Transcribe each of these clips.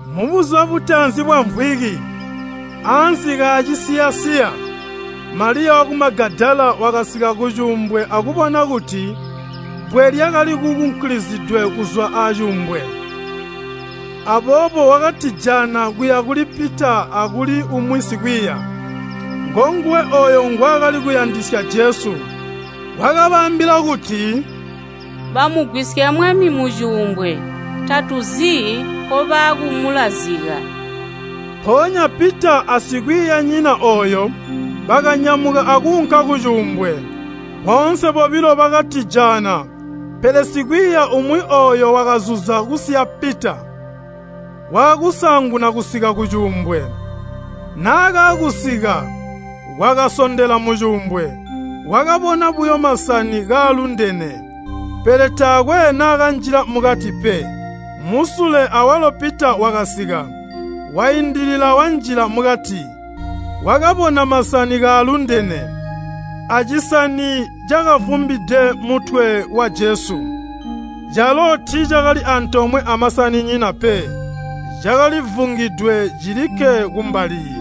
Mubuzuba butaanzi bwamvwiki, ansi kaacisiya-siya, Maliya waku Magadala wakasika kucuumbwe akubona kuti bbwe lyakali kunkulisidwe kuzwa acuumbwe. Aboobo wakatijaana kuya kuli Pita akuli umwi sikwiiya, ngonguwe ooyo ngwaakali kuyandisya Jesu, wakabaambila kuti, “Bamugwisya Mwami mucuumbwe. Tatuzi nkobaakumulazika.” Mpoonya Pita asikwiiyanyina ooyo, bakanyamuka akuunka kucuumbwe. Boonse bobilo bakatijaana, pele sikwiiya umwi ooyo wakazuza kusiya Pita, waakusaanguna kusika kucuumbwe. Naakaakusika, wakasondela mucuumbwe, wakabona buyo masani kaalundene, pele taakwe naakanjila mukati pe. Musule awalo Pita wakasika, waindilila wanjila mukati. Wakabona masani kaalundene, acisani cakavumbide mutwe wa Jesu, calo tiicakali antoomwe amasaninyina pe. Cakali vungidwe cilikke kumbali.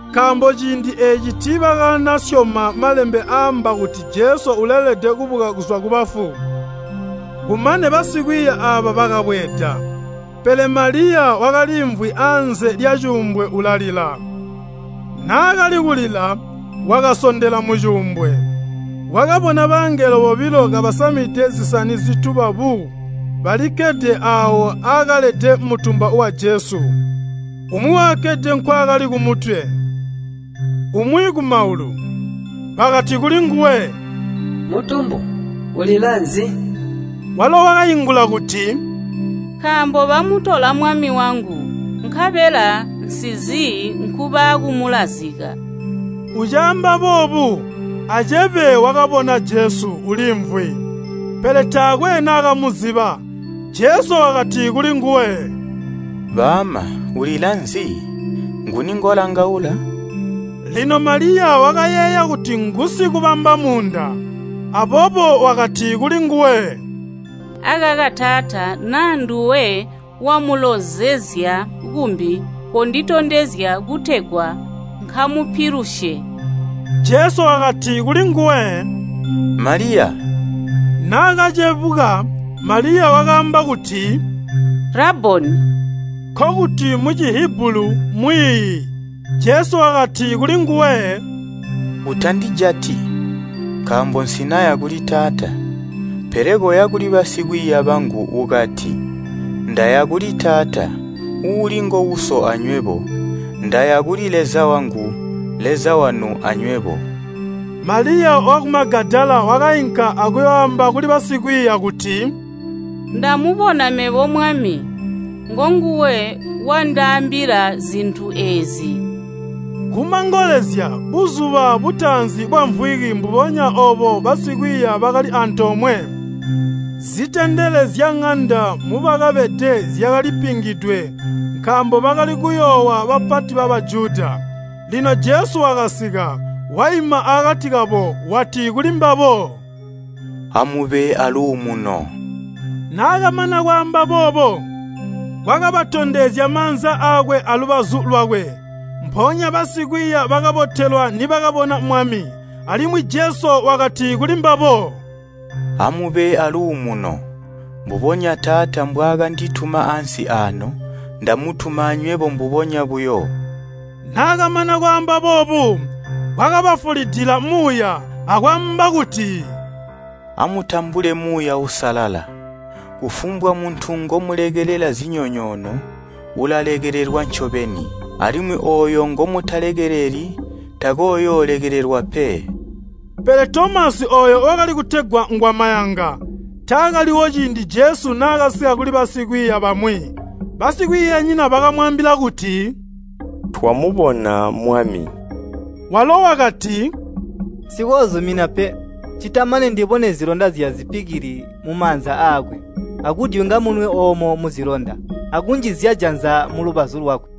Nkaambo ciindi eeci tiibakanasyoma Malembe aamba kuti Jesu uleelede kubuka kuzwa kubafu. Kumane basikwiiya aaba bakabweeda. Pele Maliya wakaliimvwi anze lyacuumbwe ulalila. Naakali kulila, wakasondela mucuumbwe. Wakabona bangelo bobilo kabasamide zisani zituba bu balikkede aawo aakalede mutumba wa Jesu. Umwi wakakkede nkwaakali kumitwe, umwi kumaulu. Bakati kulinguwe, “Mutumbu, ulila nzi?” Walo wakaingula kuti, “Nkaambo bamutola Mwami wangu, nkabela nsizi nkubaakumulazika.” Ucaamba boobu, acebe wakabona Jesu uliimvwi, pele taakwe naakamuziba. Jesu wakati kulinguwe, “Baama, ulila nzi? Nguni ngolangaula?” Lino Maliya wakayeeya kuti ngusikubamba muunda, aboobo wakati kulinguwe. “Akaka taata, naa nduwe wamulonzezya kumbi, konditondezya kutegwa nkamupilusye.” Jesu wakati kulinguwe, “Maliya!” Naakacebuka Maliya wakaamba kuti, “Rabboni!” (Nkokuti mu Cihibulu, “Mwiiyi.”) Jesu wakati kulinguwe, “Utandijati, nkaambo nsinaya kuli Taata. Pele koya kuli basikwiiya bangu ukati, ‘Ndaya kuli Taata, uuli ngo Uso anywebo. Ndaya kuli Leza wangu, Leza wanu anywebo.’” Maliya waku Magadala wakainka akuyooamba kuli basikwiiya kuti, “Ndamubona mebo Mwami. Ngonguwe wandaambila zintu eezi.” Kumangolezya, buzuba butaanzi bwamvwiki mbubonya oobo basikwiiya bakali antoomwe. Zitendele zyaŋanda mubakabede zyakali pingidwe nkaambo bakali kuyoowa bapati ba Bajuda. Lino Jesu wakasika, waima akati kabo wati kulimbabo, “Amube aaluumuno.” Naakamana kwaamba boobo, wakabatondezya maanza aakwe alubazu lwakwe. Mpoonya basikwiiya bakabotelwa nibakabona Mwami. Alimwi Jesu wakati kulimbabo, “Amube aaluumuno. Mbubonya Taata mbwaakandituma ansi aano, ndamutuma anywebo mbubonya buyo.” Naakamana kwaamba boobu, wakabafulidila muuya, akwaamba kuti, “Amutambule Muuya Uusalala. Kufumbwa muntu ngomulekelela zinyonyoono, ulalekelelwa ncobeni. Alimwi ooyo ngomutakalekeleli, takooyoolekelelwa pe!” Pele Tomasi ooyo wakali kutegwa ngwamayanga, taakaliwo ciindi Jesu naakasika kuli basikwiiya bamwi. Basikwiiyanyina bakamwaambila kuti, “Twamubona Mwami.” Walo wakati, “Nsikoozumina pe, ccita mane ndibone zilonda zyazipikili mumaanza aakwe, akudyunga munwe oomo muzilonda, akunjizya janza mulubazu lwakwe.”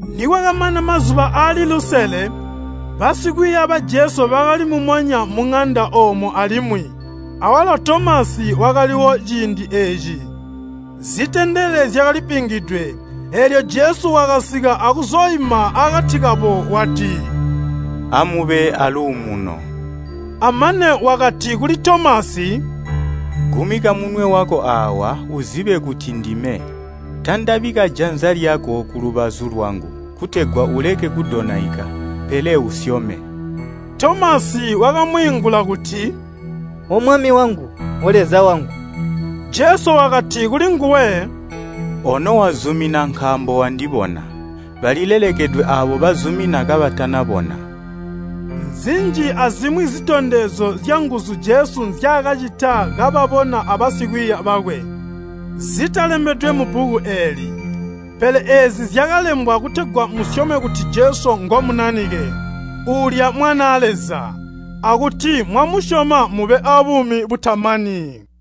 Nikwakamana mazuba aali lusele, basikwiiya ba Jesu bakali mumonya muŋanda oomo alimwi, awalo Tomasi wakaliwo ciindi eeci. Zitendele zyakali pingidwe, eelyo Jesu wakasika akuzooima akati kabo wati, “Amube aaluumuno.” Amane wakati kuli Tomasi, “Gumika munwe wako aawa, uzibe kuti ndime. Tandabika janza lyako kulubazu lwangu, kutegwa uleke kudonaika, pele usyome!” Tomasi wakamwiingula kuti, “O Mwami wangu, O Leza wangu!” Jesu wakati kulinguwe, “Ono wazumina nkaambo wandibona. Balilelekedwe aabo bazumina kabatanabona.” Nzinji azimwi zitondezyo zyanguzu Jesu nzyaakacita kababona aabasikwiiya bakwe zitalembedwe mubbuku eeli. Pele eezi zyakalembwa kutegwa musyome kuti Jesu ngo Munanike, uulya Mwanaa Leza, akuti mwamusyoma mube abuumi butamani.